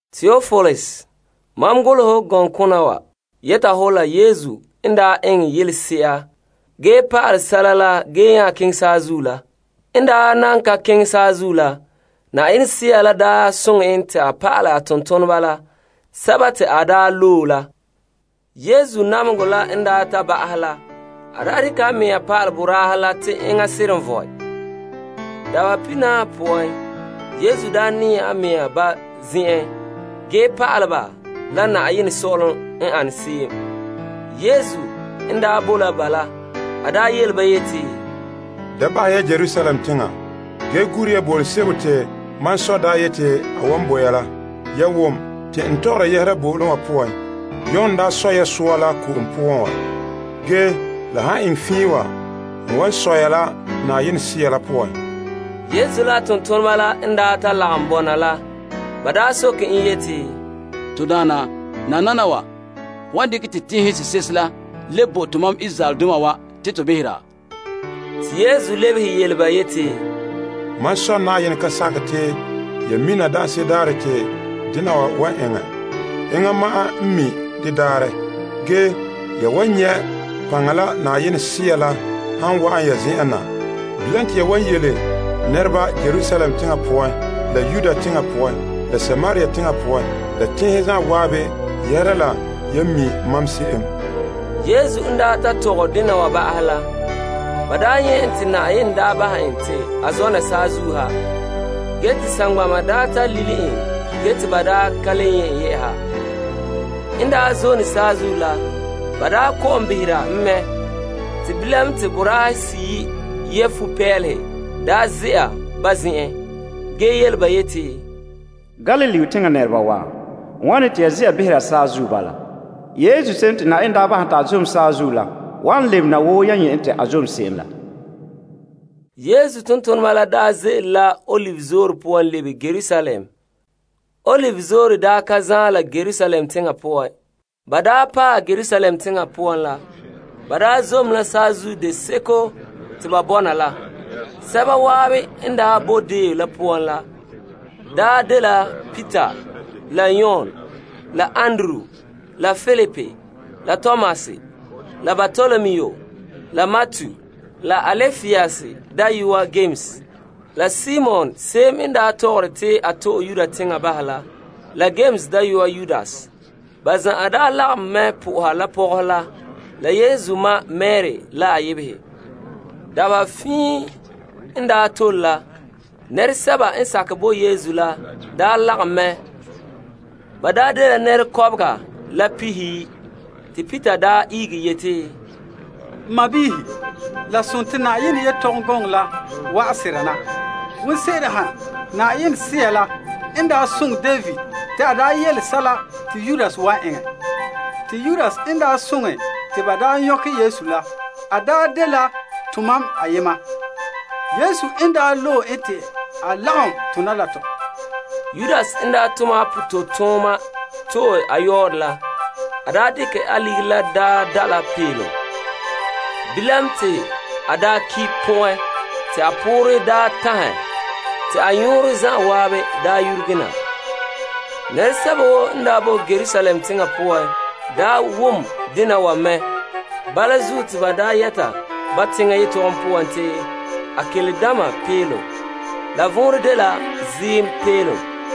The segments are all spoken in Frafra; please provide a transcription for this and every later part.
Teopilus, mam golehɛ hɔ gɔŋkona wa yɛta hɔ la Yesu n daa eŋɛ yelese'a ge pa'alɛ sɛla la ge nya keŋɛ saazuo la. En daa na ka keŋɛ saazuo la, Yenɛ Sea la daa soŋɛ en te a pa'alɛ a tontoneba la, sɛba te a daa loe la. Yesu namehegɔ la n daa ta ba'ahɛ la, a daa dekɛ a mea pa'alɛ ba la te enŋa seren vɔe. Dabaherɛ pihinaahe poan Yesu daa nɛɛ a mea ba zen'en ge pa'ale ba la Yenɛ Sɔ'ɔlom n ane se'em. Yesu n daa boe la ba la, a yele ba yeti, Da bahɛ ya Yerusalem teŋa, ge ya gura bo'olom sebo te mam Sɔ' daa yeti a wan bo ya la. Ya wom te n tɔgɛ yɛhera bo'olom wa poan. Yon daa sɔ ya soa la ko'om poan wa, ge la han eŋɛ fiin wa n wan sɔ ya la Yenɛ Sea la poan. Yesu la a tontoneba la n daa ta lagom bɔna la, ba soke en yeti, To Daana, nananawa ho wan dekɛ te tenhen sese'ehe la le bo tomam Israeldoma wa te to behera? Te Yesu lebehe ba yeti, Mam Sɔ' Yenɛ ka sakɛ te ya mina daanse'ere daarɛ te dena wa wan eŋɛ. Enŋa ma'an n mi' de daarɛ. Ge ya wan nyɛ' paŋa la Yenɛ Sea la han wa'an ya zen'en na. Bilam te ya wan yele nɛreba Yerusalem teŋa poan, la Yudea teŋa poan, la Samaria teŋa poan la teŋhe zan'an yɛhera la yan mi' mam se'em. Yesu n daa ta tɔgɛ dena wa ba'ahɛ la, ba nyɛ' en te Yenɛ bahɛ en te a zɔna la saazuo ha, ge te saŋgbana ta lile en ge te ba ka le nyɛ' en. N daa zone saazuo la, ba ko'om behera en mɛ te bilam te boraahe seyi' yɛ fupeelehe ze'a ba zen'en ge yele ba yeti, Galilee teŋa nɛreba wa, wane te ya ze'a behera saazuo bala? Yesu se'em te Yenɛ daa bahɛ en te a zom saazuo la wan lebena wo yan nyɛ' en te a zom se'em la. Yesu tontoneba la daa ze'ele la Olive Zoore poan lebe Yerusalem. Olive Zoore ka zaan la Yerusalem teŋa poan. Ban daa paɛ Yerusalem teŋa poan la, ba zom la saazuo deseko te ba bɔna la. Sɛba zan'an n bo deo la poan la dela Peter la Yames la Yon la Andrew la Filip la Tomas la Bartolomu la Matu la Alpaeus dayɔa Yames la Simon se'em n tɔgɔre te a to'e Yuda teŋa bahɛ la, la Yames dayɔa Yudas. Ba zan'an lagom mɛ po'oha la pɔgɔhe la Yesu ma Mari la a yebehe. Dabeha fiin n tole la, nɛresɛba n sakɛ bo Yesu la lagom mɛ. Ba dela nɛra kɔbega la pihiyi'. Te Peter ihege yeti, N sɔɔnrɔ, la sontii Yenɛ gɔŋɔ la wa'an sera na. Wonseren ha Yenɛ Sea la daa soŋɛ David te a daa golehɛ sɛla te Yudas wan soŋɛ te ba daa nyɔkɛ Yesu. A daa dela tomam ayema. Yesu n daa loe en te a lagom tona la tɔ. Yudas n daa tom a pototooma to'e a yɔɔrɛ la, a dekɛ a ligiri la da' la bɔn'ɔn. Bilam te a ki' pɔn'ɛn te a poorɛ daa tanhɛ te a nyɔɔrɔ zan'an daa yurege na. Nɛresɛba woo n daa boe Yerusalem teŋa poan daa wom dena wa mɛ. Bala zuo te ba daa yɛta ba teŋa yetɔgom poan te Akeldama. La vɔnrɛ n de Ziim Bɔn'ɔn.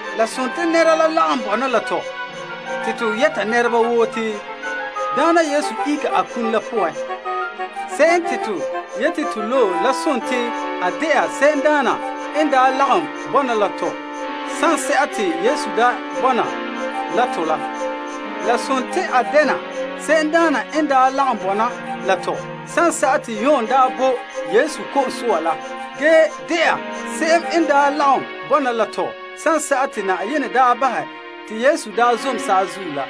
La sontii nɛra la lagom bɔna la to te to yɛta nɛra woo te Daana Yesu ihege a kum poan. Se'em te to yete te loe la sontii te a de'a se'emdaana n daa lagom bɔna la tɔ sanse'a te Yesu daa bɔna la tɔ la. La sontii a dɛna se'emdaana n daa lagom bɔna la tɔ sanse'a te Yon daa bo Yesu ko'om soa la ge de'a se'em n daa lagom bɔna la tɔ sanse'a te Yenɛ daa bahɛ te Yesu daa zom saazuo la.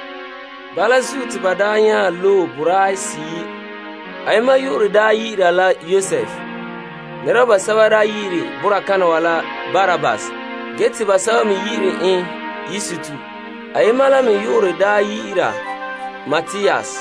Bala zuo te ba nya loe boraahe seyi'. Ayema yu'urɛ dɛna Yosef. Nɛreba basɛba yi'ire boraa kana wa la Barsabbas ge te basɛba yi'ire en Yustus. Ayema la me yu'urɛ dɛna Matias.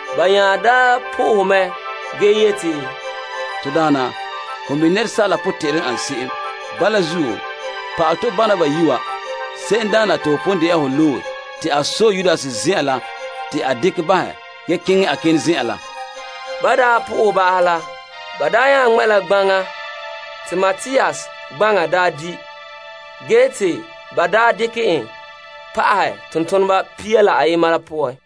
Ba nya daa po'ohɛ mɛ ge yeti, To Daana, ho mi' asaala potɛn'ɛrɛ n ane se'em. Bala zuo, pa'alɛ tɔ bana bayi' wa se'emdaana te ho pon de'a ho loe, te a sɔe Yudas zen'an la te a dekɛ bahɛ ge keŋɛ a kenɛ zen'an la. Ban daa po'ohɛ ba'ahɛ la, ba nya ŋmɛ' la gbaŋa te Matias baŋa di' ge te ba dekɛ en pa'ahɛ tontoneba pia la ayena la poan.